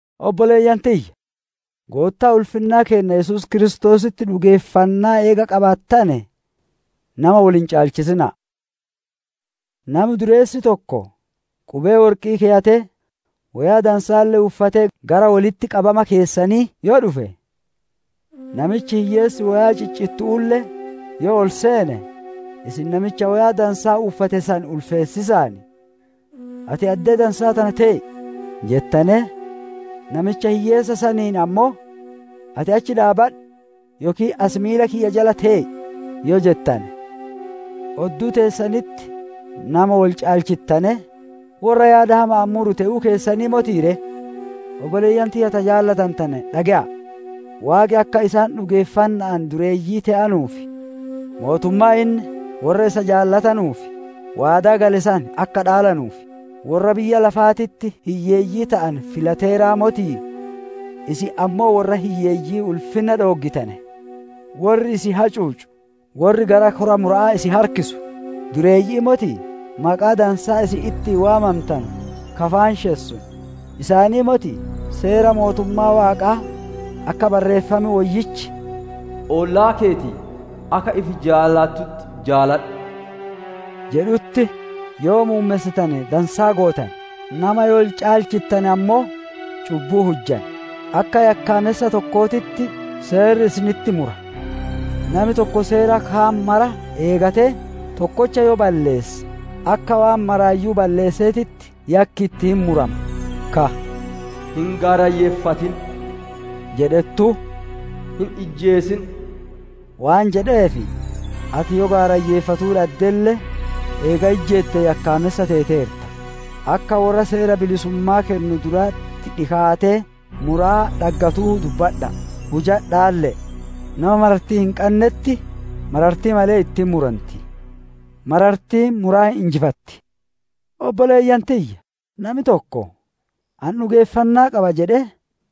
Obboleeyyan tiyya! Goottaa ulfinnaa keenna Yesuus Kiristoositti dhugeeffannaa eega qabaattane, nama wol hin caalchisina'a. Nami dureessi tokko qubee worqi'ii keyatee, woyaa dansaalle uffatee gara wolitti qabama keessanii yoo dhufe, namichi hiyyeessi woyaa ciccittu'uulle yoo ol seene, isin namicha woyaa dansaa uffate san ulfeessiisaan, «Ati addee dansaa tana tee'i» jettanee, namicha hiyyeessa saniin ammoo, «Ati achi dhaabbadhu yookiin as miila kiyya jala tee'i» yoo jettane, odduu teessanitti nama wol caalchittanee, worra yaada hama'aan muru te'uu keessanii motii ree? Obboleeyyan tiyya ta jaalatantane, dhage'aa! Waaqi akka isaan dhugeeffanna'aan dureeyyii te'anuu fi mootummaa inni worra isa jaalatanuuf waadaa gale san akka dhaalanuuf, worra biyya lafaatitti hiyyeeyyii te'ane filateeraa motii? Isin ammoo worra hiyyeeyyii ulfinna dhooggitane; worri isin hacuucu, worri gara kora mura'aa isin harkisu dureeyyi'ii motii? Maqaa dansaa isin ittiin waamantanu ka faanshessu isaanii motii? Seera mootummaa Waaqaa akka Barreeffam Woyyichi, «Ollaa keeti akka ifi jaalattutti jaaladhu» jedhutti, yoo muummessitane dansaa gootane. Nama yoo wol caalchittane ammoo cubbuu hujjan; akka yakkaamessa tokkootitti seerri isinitti mura. Nami tokko seera kaan mara eegatee, tokkocha yoo balleesse, akka waan maraayyuu balleesseetitti yakki itti hin murama. Ka, «Hin gaarayyeeffatin» jedhettuu, «Hin ijjeesin» waan jedheef, ati yoo gaarayyeeffatuu dhaddelle, eega ijjeette yakkaamessa teeteerta. Akka worra seera bilisummaa kennu duratti dhikaatee muraa dhaggatuu dubbadha'a, hujadhaalle'e. Nama marartii hin qannetti, marartii malee itti hin muranti; marartiin muraa hin injifatti. Obboleeyyan tiyya! Nami tokko, «Ani dhugeeffannaa qaba» jedhee,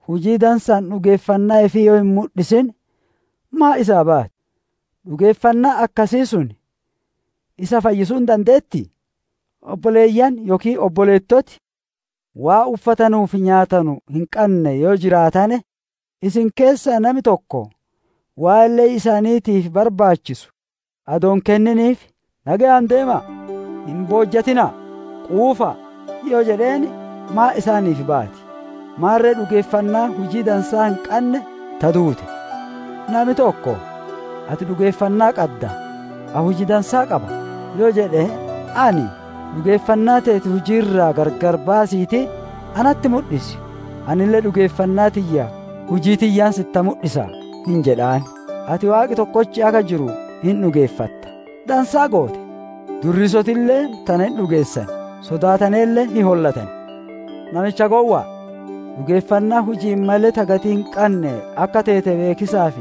hujii dansa'aan dhugeeffannaa ifii yoo hin mudhisin, maan isaa baati? Dhugeeffannaan akkasii sun isa fayyisuu hin dandeettii? Obboleeyyan yookiin obboleettoti, waan uffatanuu fi nyaatanu hin qanne yoo jiraatane, isin keessaa nami tokko, waan le'ii isaaniitiif barbaachisu adoo hin kenniniif, «Nageyaan deema'a, hin boojjatina'a, quufa'a!» yoo jedheen, maan isaaniif baati? Maarre dhugeeffannaan hujii dansaa hin qanne ta duute. Nami tokko, «Ati dhugeeffannaa qadda; ani hujii dansaa qaba» yoo jedhe, ani, «Dhugeeffannaa teeti hujii irraa gargar baasiitii natti mudhisi; anille dhugeeffannaa tiyya hujii tiyyaan sitti mudhisa» hin jedhaan. Ati Waaqi tokkochi akka jiru hin dhugeeffatta; dansaa goote! Durriisotille tana hin dhugeessan, sodaataneelle hin hollatan. Namicha gowwa'a! Dhugeeffannaan huji'iin malee ta gatii hin qanne akka teete beekiisaaf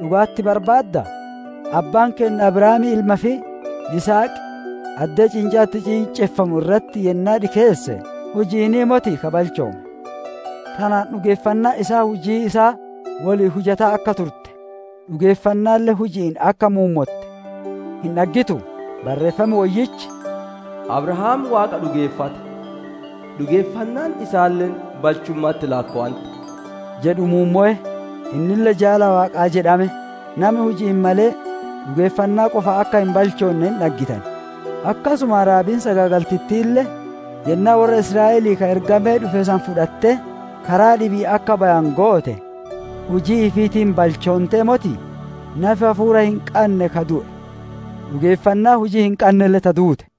dhugaa itti barbaaddaa? Abbaan keenna Abrahaam ilma ifii Yisihaq, addee ciincaan itti ciinceffamu irratti yennaa dhikeesse, huji'iinii motii ka balchoome? Tanaan dhugeeffannaan isaa hujii isaa woliin hujataa akka turte, dhugeeffannaalle huji'iin akka muummotte hin dhaggituu? Barreeffam Woyyichi, «Abrahaam Waaqa dhugeeffate, dhugeeffannaan isaalle balchumma'atti laakkowante» jedhu muummowe; innille jaala Waaqaa jedhame. Nami huji'iin malee, dhugeeffannaa qofaan akka hin balchoonne hin dhaggitan. Akkasuma, Rahaabiin sagaagaltittiille yennaa worra Israa'elii ka ergamee dhufe san fudhattee, karaa dhibi'iin akka bayanu goote, hujii ifiitiin balchoontee motii? Nafi hafuura hin qanne ka du'e; dhugeeffannaan hujii hin qannelle ta duute.